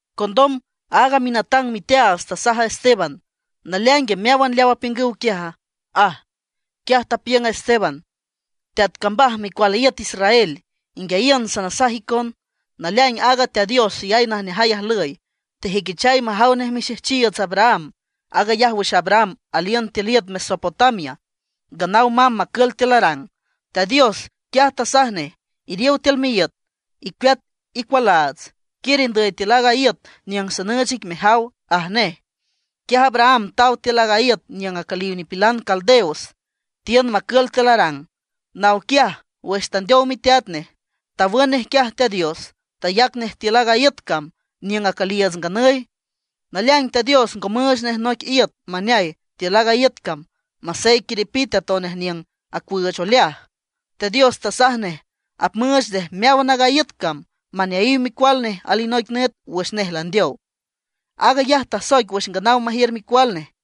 Condom aaga minatang miteaats tasaj a Esteban: ―¿Naleaingue meáwan leaw apiüngüw quiaja? ―aj. Quiaj tapiüng a Esteban: ―Teat cambaj micual iüt Israel, inguiayiün sanasaj icon. Naleaing aaga Teat Dios xeyay najneajay ajlüy, tejüiquichay majaw nej mixejchiiüts Abraham. Aag ayaj wüx Abraham aliün tiül iüt Mesopotamia, nganaw mamb macül tiül Harán. Teat Dios quiaj tasaj nej: “Iriow tiül miíüt, icueat icualaats, quiür indüy tiül aaga iüt niüng sanüüch ic mejaw”, aj nej. Quiaj Abraham taw tiül aaga iüt niüng acüliw nipilan Caldeos, tiün macül tiül Harán. Naw quiaj, wüx tandeow miteat nej, tawün nej quiaj Teat Dios; tayac nej tiül aaga iüt cam niüng acüliiüts nganüy. Naleaing Teat Dios ngo müüch nej noic iüt maneay tiül aaga iüt cam, masey quiripite atonej niüng acuüüch oleaj. Teat Dios tasaj nej apmüüch nej meáwan aaga iüt cam maneayiw micual nej alinoic nüt wüx nej landeow. Aag ayaj tasoic wüx nganaw majiür micual nej.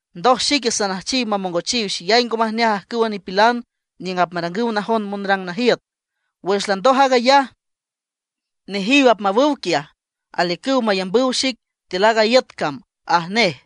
Ndoj xique sanüjchiw mamongochiw xeyay ngo majneaj ajcüwa nipilan niüng apmarangüw najon monrang najiüt. Wüx landoj aag ayaj, nejiw apmawüw quiaj, aliücüw mayambüw xic tiül aaga iüt cam”, aj nej.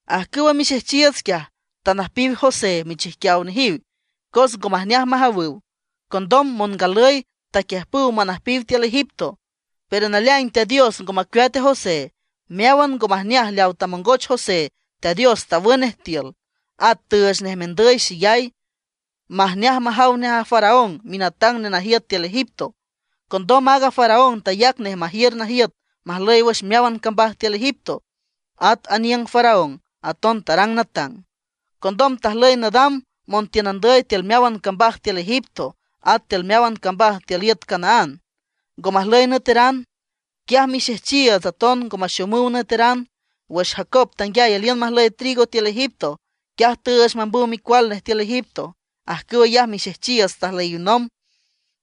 ’Ajcüwa mixejchiiüts quiaj, tanüjpiw José michijquiaw nejiw, cos ngo majneaj majawüw. Condom mongalüy taquiüjpüw manüjpiw tiül Egipto. Pero naleaing Teat Dios ngo macueat a José. Meáwan ngo majneaj leaw tamongoch José, Teat Dios tawün nej tiül. At tüüch nej mendüy xeyay, majneaj majaw nej a Faraón minatang nenajiüt tiül Egipto. Condom aaga Faraón tayac nej majiür najiüt majlüy wüx meáwan cambaj tiül Egipto, at tiül aniüng a Faraón aton tarang natang. ’Condom tajlüy nadam montiün andüy tiül meáwan cambaj tiül Egipto. At tiül meáwan cambaj tiül iüt Canaán ngo majlüy nüeteran. Quiaj mixejchiiüts aton ngo maxomüw nüeteran. Wüx Jacob tanguiay aliün majlüy trigo tiül Egipto, quiaj tüüch mambüw micual nej tiül Egipto. Ajcüw ayaj mixejchiiüts tajlüyiw nomb.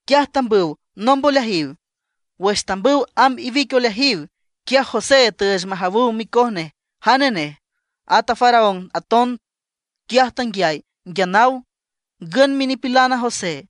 Quiaj tambüw nomb oleajiw. Wüx tambüw amb iwic oleajiw, quiaj José tüüch majawüw micoj nej jane nej. At a Faraón aton quiaj tanguiay nguia naw, ngün minipilan a José.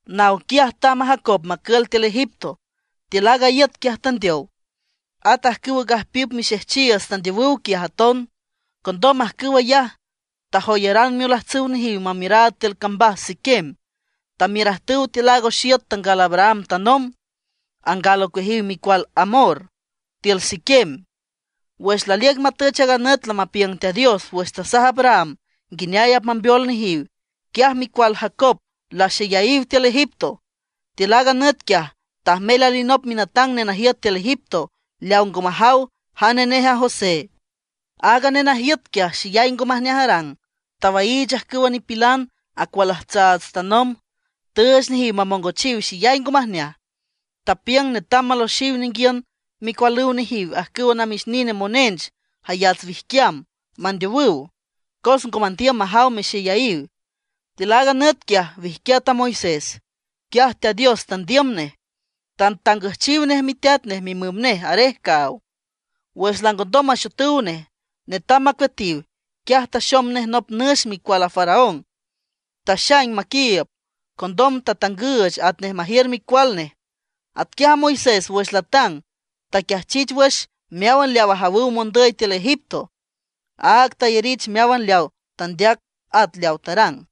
Naw quiaj tamb a Jacob macül tiül Egipto. Tiül aaga iüt quiaj tandeow. At ajcüwa gajpiüp mixejchiiüts tandeowüw quiaj aton. Condom ajcüw ayaj, tajoyaran miolajtsüw nejiw mamiüraad tiül cambaj Siquem. Tamiürajtüw tiül aaga oxiüt tangal Abraham tanomb, angal ocueajiw micual Hamor tiül Siquem. ’Wüx laliüc matüch aaga nüt lamapiüng Teat Dios wüx tasaj Abraham nguineay apmambeol nejiw, quiaj micual Jacob laxeyayiw tiül Egipto. Tiül aaga nüt quiaj, tajmel alinop minatang nenajiüt tiül Egipto, leaw ngo majaw jane nej a José. Aaga nenajiüt quiaj, xeyay ngo majneaj arang, tawaiich ajcüwa nipilan acualajtsaats tanomb. Tüüch nejiw mamongochiw xeyay ngo majneaj. Tapiüng netam maloxiw ninguiün micualüw nejiw ajcüw namix nine monench jayats wijquiam, mandeowüw, cos ngo mandiüm majaw mexeyayiw. Tiül aaga nüt quiaj, wijquiat a Moisés. Teat Dios tandiüm nej, tatangüjchiw nej miteat nej mimüm nej arej caaw. Wüx langondom maxotüw nej, netam macueatiw; quiaj taxom nej nop nüx micual a Faraón, taxaing maquiiüb. Condom tatangüüch atnej majiür micual nej. Atquiaj Moisés wüx latang taquiajchich wüx meáwan leaw ajawüw mondüy tiül Egipto, áag tayarich meáwan leaw tandeac at leaw tarang.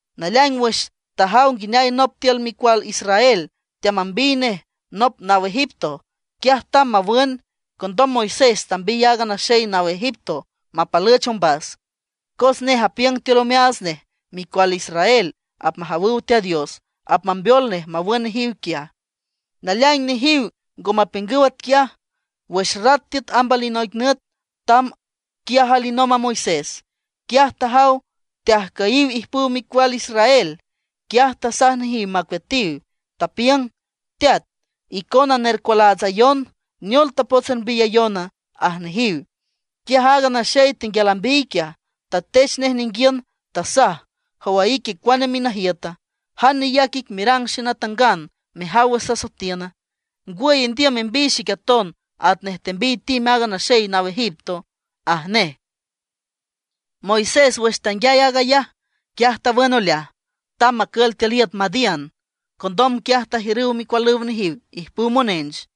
Naleaing wüx tajaw nguineay nop tiül micual Israel, teamambiy nej nop naw Egipto, quiaj tamb mawün. Condom Moisés tambiy aaga naxey naw Egipto mapalüch ombas. Cos nej apiüng tiül omeaats nej micual Israel apmajawüw Teat Dios apmambeol nej mawün nejiw quiaj. Naleaing nejiw ngo mapiüngüw atquiaj. Wüx rat tiüt amb alinoic nüt tamb quiaj alinomb a Moisés. Quiaj tajaw teajcüyiw ijpüw micual Israel. Quiaj tasaj nejiw macueatiw, tapiüng: “Teat, icona nercualaatsayon; ¿neol tapots ermbiyayona?” aj nejiw. Quiaj aaga naxey tenguial ambiy quiaj, tatech nej ninguiün, tasaj: “¿Jow a ique cuane minajiüta, jan neyac ic merang xenatangana, mejaw wüx sasoetiüna? ¿Ngwüy, indiüm membiy xic aton, atnej tembiy tim aaga naxey naw Egipto?” aj nej. Moisés wüx tanguiay aag ayaj, quiaj tawün oleaj, tamb macül tiül iüt Madián. Condom quiaj tajiürüw micualüw nejiw ijpüw monench.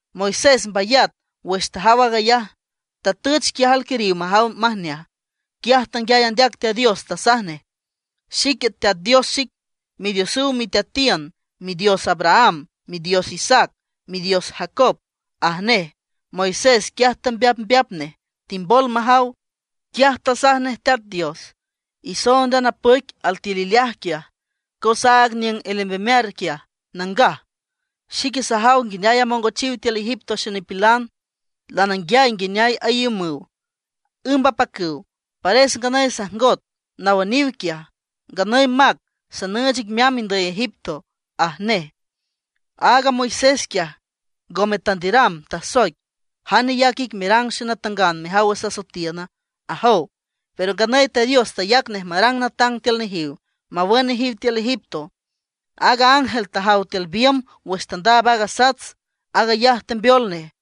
Moisés mbayat wüx tajaw aag ayaj, tatüch quiaj alquiriw majaw majneaj. Quiaj tanguiay andeac Teat Dios, tasaj nej: “Xique Teat Dios xic, Midiosüw miteatiün, Midios Abraham, Midios Isaac, Midios Jacob”, aj nej. Moisés quiaj tambeapmbeap nej, timbol majaw. Quiaj tasaj nej Teat Dios: “Isoond a napüic altiül ileaj quiaj, cos aaga niüng alembemear quiaj nangaj. Xique sajaw nguineay amongochiw tiül Egipto xenipilan, lananguiay nguineay aiümüw, ümb apacüw. Pares nganüy sajngot nawüniw quiaj. Nganüy mac, sanüüch ic meamb indüy Egipto”, aj nej. ’Aaga Moisés quiaj, ngome tandiüram, tasoic: “¿Jan neyac ic merang xenatangan mejaw wüx sasoetiüna?” ajow. Pero nganüy Teat Dios tayac nej marang natang tiül nejiw, mawün nejiw tiül Egipto. Aaga ángel tajaw tiül biümb wüx tandaab aaga sats, aag ayaj tembeol nej.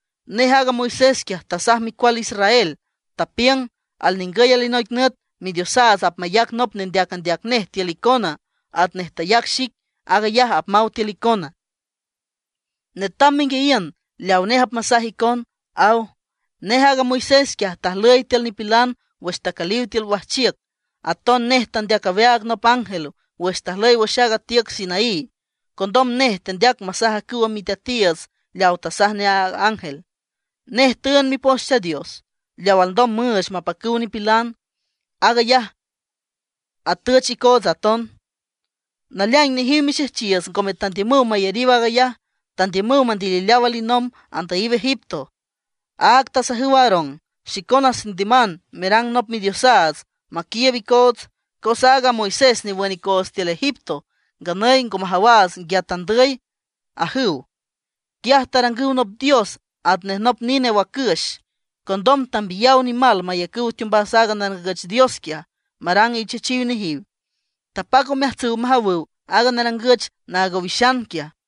Nej aaga Moisés quiaj, tasaj micual Israel, tapiüng: “Alningüy alinoic nüt Midiosaats apmayac nop nendeac andeac nej tiül icona, atnej tayac xic. Aag ayaj apmaw tiül icona. Netam menguiayiün leaw nej apmasaj icon”, aw. Nej aaga Moisés quiaj, tajlüy tiül nipilan wüx tacüliw tiül wajchiüc. Aton nej tandeac aweaag nop ángel wüx tajlüy wüx aaga tiüc Sinaí. Condom nej tandeac masaj ajcüwa miteatiiüts leawa tasaj nej a ángel. Nej tüünd Mipoch Teat Dios, leaw alndom müüch mapacüw nipilan. Aag ayaj atüch icootsa aton. ’Naleaing nejiw mixejchiiüts ngome tandiümüw mayariw aag ayaj; tandiümüw mandilileaw alinomb andüyiw Egipto. Áag tasajüw Aarón: “Xicona sandiüman merang nop midiosaats maquiiüb icoots. Cos aaga Moisés newün icoots tiül Egipto, nganüy ngo majawaats nguia tandüy”, ajüw. Quiaj tarangüw nop dios atnej nop nine wacüx. Condom tambiyaw nimal mayacüw teombas aaga narangüch dios quiaj, marang ichechiw nejiw. Tapac omeajtsüw majawüw aaga narangüch naag owixan quiaj.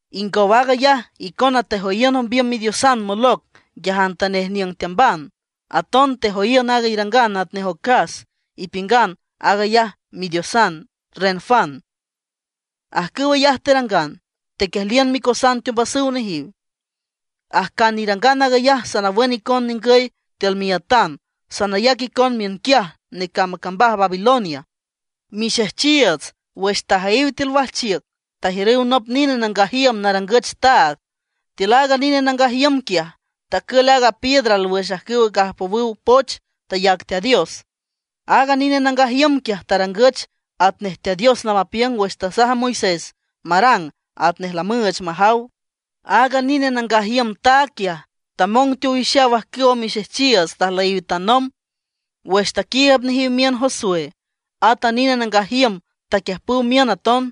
Ingow aag ayaj, icona tejoyiün ombiüm midiosan Moloc nguiajantanej niüng teamban. Aton tejoyiün aaga irangan atnej ocas, ipiüngan aag ayaj midiosan Renfán. Ajcüw ayaj terangan, tequiejliün micosan teombasüw nejiw. Ajcan irangan aag ayaj sanawün icon ningüy tiül miiütan, sanayac icon miünquiaj necamb a cambaj Babilonia. ’Mixejchiiüts, wüx tajüyiw tiül wajchiüc tajiürüw nop nine nangaj iüm narangüch taag. Tiül aaga nine nangaj iüm quiaj tacül aaga piedra alwüx ajcüw gajpowüw poch tayac Teat Dios. Aaga nine nangaj iüm quiaj tarangüch atnej Teat Dios lamapiüng wüx tasaj a Moisés marang atnej lamüüch majaw. Aaga nine nangaj iüm taag quiaj tamong teowixaw ajcüwa mixejchiiüts tajlüyiw tanomb. Wüx taquiiüb nejiw miün Josué, at a nine nangaj iüm taquiüjpüw miün aton.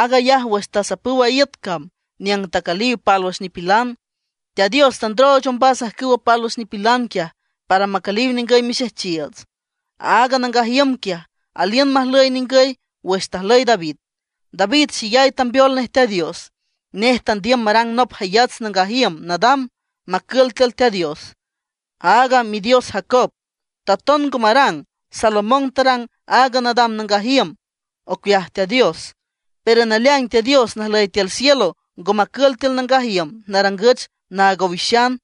Aag ayaj wüx tasapüw aaga iüt cam niüng tacüliw pálwüx nipilan. Teat Dios tandrooch ombas ajcüwa pálwüx nipilan quiaj, para macüliw ningüy mixejchiiüts. Aaga nangaj iüm quiaj, aliün majlüy ningüy wüx tajlüy David. David xeyay tambeol nej Teat Dios, nej tandiüm marang nop jayats nangaj iüm nadam, macül tiül Teat Dios, aaga midios Jacob. Taton ngo marang, Salomón tarang aaga nadam nangaj iüm ocueaj Teat Dios. Pero naleaing Teat Dios najlüy tiül cielo, ngo macül tiül nangaj iüm narangüch naag owixan,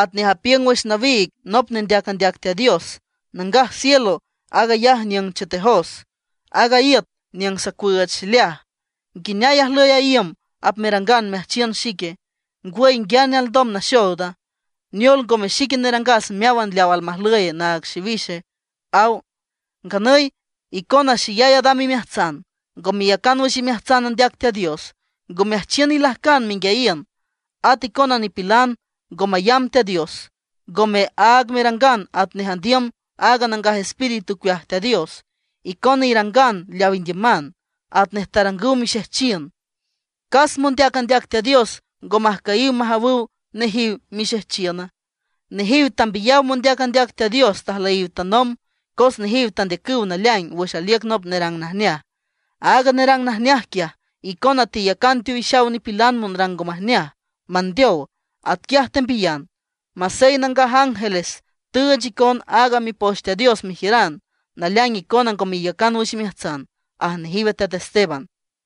atnej tapiüng wüx nawiig nop nendeac andeac Teat Dios: Nangaj cielo aag ayaj niüng chetejos, aaga iüt niüng sacuüüch xileaj. ¿Nguineay ajlüy a iüm apmerangan meajchiün xique? ¿Ngwüy nguiane alndom naxooda? ¿Neol, ngome xique nerangas meáwan leaw almajlüye naag xiwixe?, aw. ’Nganüy icona xeyay adam imeajtsan, ngo meyacan wüx imeajtsan andeac Teat Dios, ngo meajchiün ilajcan menguiayiün. At icon nipilan ngo mayamb Teat Dios; ngome áag merangan atnej andiüm a Nangaj Espíritu ocueaj Teat Dios. Icona irangan leaw indiüman, atnej tarangüw mixejchiün. ¿Cas mondeac andeac Teat Dios ngo majcüyiw majawüw nejiw mixejchiüna? Nejiw tambiyaw mondeac andeac Teat Dios tajlüyiw tanomb, cos nejiw tandeacüw naleaing wüx aliüc nop nerang najneaj. Aaga nerang najneaj quiaj, icona teyacan teowixaw nipilan monrang ngo majneaj, mandeow; atquiaj tembiyan. Masey nangaj ángeles tüüch icon aaga Mipoch Teat Dios mejiüran, naleaing icona ngo meyacan wüx imeajtsan, aj nejiw a teat Esteban.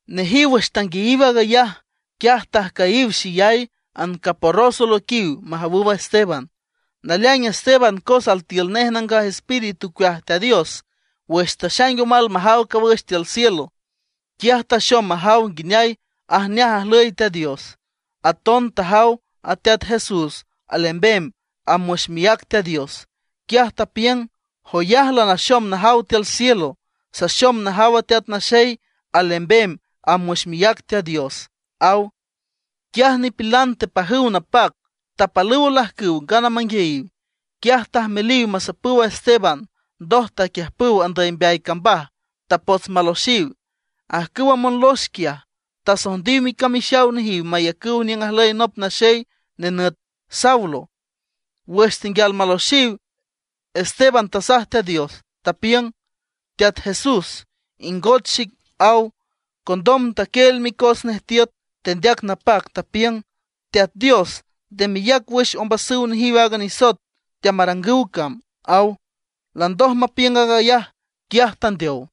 Nejiw wüx tanguiayiw aag ayaj, quiaj tajcüyiw xeyay, ancaporros olüiquiw majawüw a Esteban. Naleaing Esteban, cos altiül nej Nangaj Espíritu ocueaj Teat Dios, wüx taxaing omal majaw cawüx tiül cielo, quiaj taxom majaw nguineay ajneaj ajlüy Teat Dios; aton tajaw a Teat Jesús alembem amb wüx miác Teat Dios. Quiaj tapiüng: ―¡Joyaj lanaxom najaw tiül cielo! Saxom najaw a Teat Naxey alembem amb wüx miác Teat Dios ―aw. Quiaj nipilan tepajüw napac, tapalüw olajcüw ngana manguiayiw. Quiaj tajmeliw masapüw a Esteban. Ndoj taquiüjpüw andüy mbeay cambaj, tapots maloxiw. Ajcüwa monlox quiaj, tasojndiw micamixaw nejiw mayacüw niüng ajlüy nop naxey nenüt Saulo. Wüx tenguial maloxiw, Esteban tasaj Teat Dios, tapiüng: ―Teat Jesús, ingoch xic ―aw. Condom taquieel micos nej tiüt, tendeac napac, tapiüng: ―Teat Dios, nde meyac wüx ombasüw nejiw aaga nisoet teamarangüw cam ―aw. Landoj mapiüng aag ayaj, quiaj tandeow.